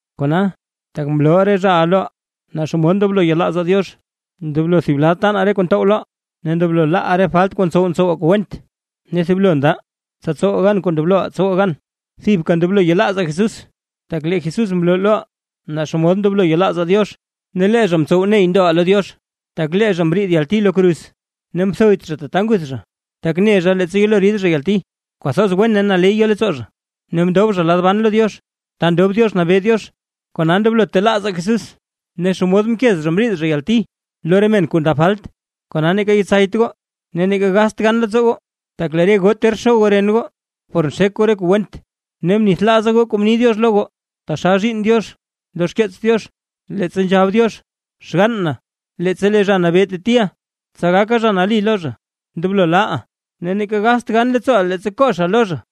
Kona, tak mlooʼa re zhaʼa loʼaa naa xomod ndoblo yelaazaa Diox, ndoblo thib lad taanaa re kuu ntow loʼaa, ne ndoblo laaʼaa re falt kuu ntsow ntsowaa kuu went, ne thiblo ndaʼaa tsa tsowaa gan kuu ndobloʼaa tsowaa gan, thibka ndoblo yelaazaa Jesús, tak lee Jesús mloo loʼaa naa xomod ndoblo yelaazaa Diox, ne lee zha ntsow ney ndoʼaa lo Diox. Tak lee zha mriid yalti lo kruz, ne mthoyt zha tata nguth zha, tak ne zha leettsa yelo rid zha yalti, kwathoz wen ne naley yo leettsoo zha; ne mndob zha lad ban lo Diox ta ndob Diox nabee Diox. Kona ndoblo telaazaa Jesús, ne xomod mkez zha mriid zha yalti lo re men kuu ndab falt; kona neeka yetsayt goo ne neeka gast gan leettsoo goo. Tak lee re goo ter xo goo ren goo, por nxek goo re kuu went; ne mnithlaaza goo kuu mni Diox lo goo taxal zhiinn Diox lo xkeets Diox, leettsa nzhab Diox: Xgann na, leettsa lee Zha Nabee teliʼa, tsa gaka zha nali lo zha, ndoblo laaʼa, ne neeka gast gan leettsooʼa leettsa koxa lo zha.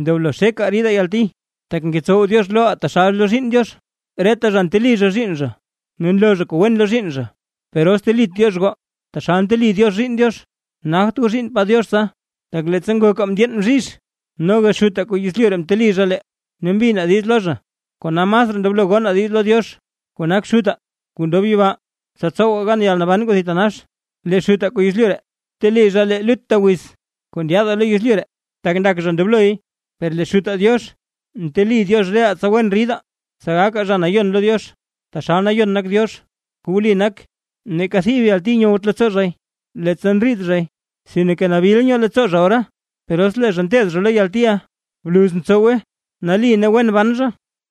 Ndoblo xekaa ridaa yalti, tak ngetsow Diox loʼaa taxal lo zhiinn Diox. Reta zha nteli zha zhiinn zha ne nloo zha kuu wen lo zhiinn zha. Per os telit Diox goo, taxal nteli Diox zhiinn Diox, nagt goo zhiinnpaa Diox tsa. Tak leettsa ngokaa ndyeen bzhizh, noga xutaa kuu yezlyu ree mteli zha lee, ne mbinaa diiz lo zha. Kona masraa ndoblo gonaa diiz lo Diox kuu nak Xutaa kuu ndob yibaa, tsa tsowaa gan yalnaban kuu thitanax. Lee xutaa kuu yezlyu ree, mteli zha lee lut wiz kuu ndyaadaa lo yezlyu ree, taxal ndak zha ndobloy; per lee Xutaa Diox nteli Diox reʼaa tsa wen ridaa, tsa gakaa zha nayon lo Diox taxal nayon nak Diox. Kuu wli nak, neeka thib yalti nyowt leettsoo zhay leettsa ndriid zhay, sinke nabil nyoo leettsoo zha ora; per os lee zha nteed zha lo yaltiʼa, bluz ntsowe nali ne wen ban zha.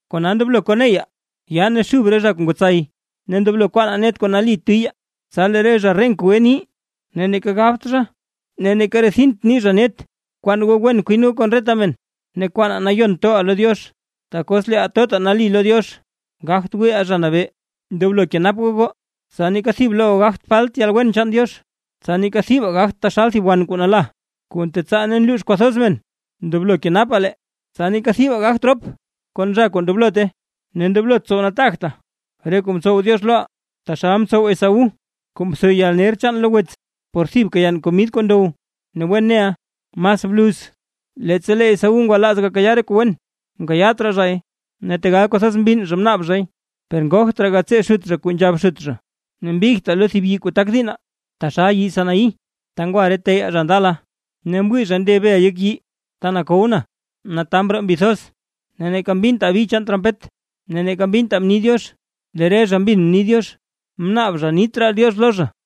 Kona ndoblo koneyaa yaa ne zhub re zha kuu ngwatsay, ne ndoblo kwaanaa net kuu nali tiyaa. Tsa lee re zha renk gwe nii ne neeka gabt zha ne neeka rethint nii zha net. Bkwaan goo wen kwin goo kon reta men; ne kwaanaa nayon toʼaa lo Diox, tak os leeʼaa totaa nali lo Diox, gagt wiiʼaa Zha Nabee. Ndoblo kenap goo goo, tsa neeka thib lo goo gagt falt yalwen chaan Diox, tsa neeka thibaa gagtaa taxal thib wan kuu nala, kuu ntetsaa ne nluux kwathoz men. Ndoblo kenapaa lee, tsa neeka thibaa gagt rop kon zha kuu ndoblote, ne ndoblot tsow nataagtaa re kuu mtsow Diox loʼaa, taxal mtsow Esaú kuu mtho yalner chaan lo wets, por thibka yann komid kuu ndow. Ne wen neʼaa, mas bluz leettsa lee Esaú ngwalaaz gakayaa re kuu wen, mkayaat raa zhay; ne tegal kwathoz mbinn zha mnaab zhay, per ngogt raa gatsee xut zha kuu nzhab xut zha. Ne mbigtaa lo thib yii kuu tak diinnaa, taxal yii Sinaí, ta ngwa re teyaa zha ndala, ne mwii zha nde bel yek yii, ta nakow na, ne taa mroo mbi thoz; ne neeka mbintaa bi chaan trompet ne neeka mbintaa mni Diox. Lee re zha mbin mni Diox, mnaab zha nit raa Diox lo zha.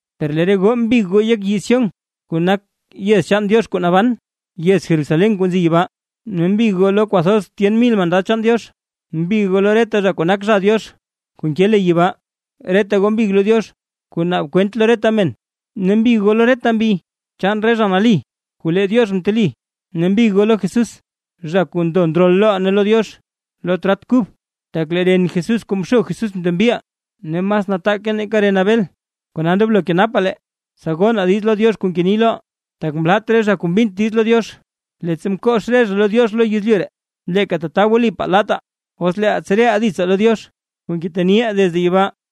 Per lee re goo mbig goo yek yii Sión kuu nak yez chaan Diox kuu naban, yez Jerusalén kuu nzi yibaa ne mbig goo lo kwathoz tyen mil mandad chaan Diox, mbig goo lo reta zha kuu nak zha Diox kuu nke le yibaa. Reta goo mbig goo lo Diox kuu naab kwent lo reta men, ne mbig goo lo reta mbi chaan re zha nali kuu lee Diox mteli. Ne mbig goo lo Jesús zha kuu ndo ndrol loʼaa ne lo Diox lo trat kub, tak lee ren Jesús kuu mxo Jesús mtembiʼaa, ne mas nataake nake ren Abel. Kona ndoblo kenapaa lee, tsa gonaa diiz lo Diox kuu ngeni loʼaa. Tak mlat re zha kuu mbint diiz lo Diox, leettsa mkox re zha lo Diox lo yezlyu ree; leeka tata wlipaa laataa, os leeʼaa tsereʼaa ditsaa lo Diox kuu ngeteniʼaa desde yibaa.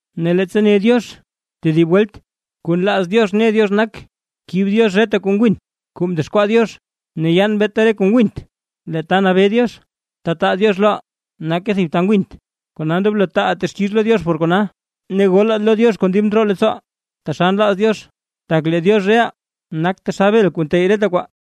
Ne leettsa ne Diox: “tedib welt”, kuu nlaaz Diox ne Diox nak kib Diox reta kuu ngwin kuu mdexkwaa Diox, ne yaan beeta re kuu ngwint. Lee ta nabee Diox, ta taa Diox loʼaa nake thib ta ngwint. Kona ndoblo taaʼaa texkix lo Diox por kona ne golaa lo Diox kon dib ndroo leettsooʼaa taxal nlaaz Diox, tak lee Diox reʼaa nak taxal bel kuu nteyy reta kwaa.